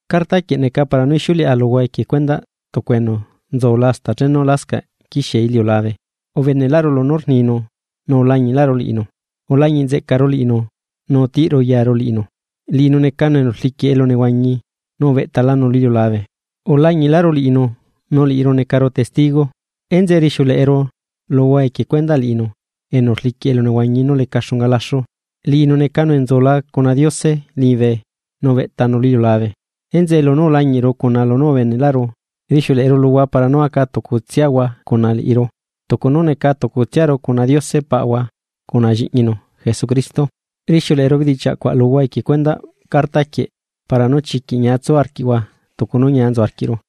Carta quieꞌ neca para nú ixiuleꞌa luhua equie cuendaꞌ tucu bene enu nzula hasta chenu lascaꞌ quixie iliulabe, ubeneꞌlaꞌru lunú rninu nu ulañiꞌlaꞌru liꞌinu, ulañiꞌ nzeꞌcaru liꞌinu nu utiꞌru yaru liꞌinu. Liꞌinu necanu enu rliquiꞌ elunehuañi, nu ubeꞌtalanu lu iliulabe. Ulañiꞌlaꞌru liꞌinu nu liꞌiru necaru testigo, enzeꞌe rixiuleꞌeru luhua equie cuendaꞌ liꞌinu enu rliquiꞌ elunehuañi nú leca xunga laxu. Liꞌinu necanu enu nzula cuna Diose liñibe nu ubeꞌtanu lu iliulabe. Enzeꞌe lunú ulañiꞌru, cuna lunú ubeneꞌlaꞌru, rixiuleꞌeru luhua para nú aca tucutsiahua cuna liꞌiru, tucu nú neca tucutsiaru cuna Diose Paꞌahua cuna Lliꞌñinu Jesucristo. Rixiuleꞌeru bedichiaꞌ cuaꞌ luhua equie cuendaꞌ carta quieꞌ para nú chiquiꞌ ñia tsu arquiꞌhua tucu nú ñia nzu arquiꞌru.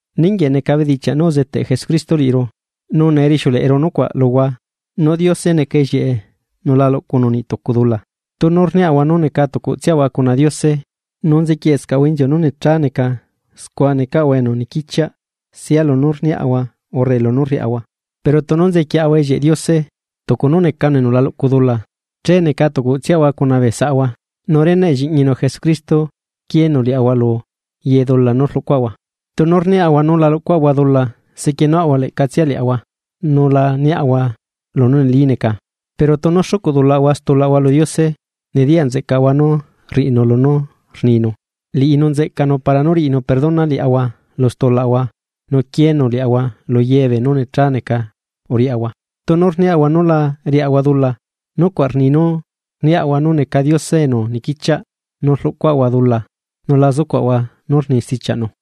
Ninguieꞌ neca bedichiaꞌ nú uzeteꞌ Jesucristo liꞌiru, nu nee rixiuleꞌeru nucuaꞌ luhua, nú Diose neca ellieꞌe nu la luꞌcunu niꞌ tucu dula. Tunu rniaꞌahua nú neca tucutsiaꞌahua cuna Diose, nu nzequieꞌscaꞌahua inziu nú necha neca, scua necaꞌahua enu niquichiaꞌ sia lunú rniaꞌahua urre lunú rriaꞌahua. Pero tunu nzequieꞌahua ellieꞌ Diose, tucu nu necanu enu la luꞌcu dula, che neca tucutsiaꞌahua cuna bee saꞌahua, nu reneꞌ Lliꞌñinu Jesucristo quieenu liaꞌahua lu ye dula nú rluꞌcuaꞌahua. Tunu rniaꞌahua nú la luꞌcuaꞌahua dula sequienuaꞌahua leꞌcatsia liaꞌahua, nu la niaꞌahua lunú neli neca. Pero tunu xucuꞌ dulaꞌahua stulaꞌahua lu Diose, nediyaꞌ nzeꞌcaꞌahua nú rriꞌinu lunú rninu, liꞌinu nzeꞌcanu para nú riꞌinu perdona liaꞌahua lu stulaꞌahua nu quieenu liaꞌahua lu ye beenú necha neca uriaꞌahua. Tunu rniaꞌahua nú la riaꞌahua dula, nucuaꞌ rni nú rniaꞌahua nu neca Diose enu niquichiaꞌ nu rluꞌcuaꞌahua dula nu la zucuaꞌahua nú rni stichiaꞌnu.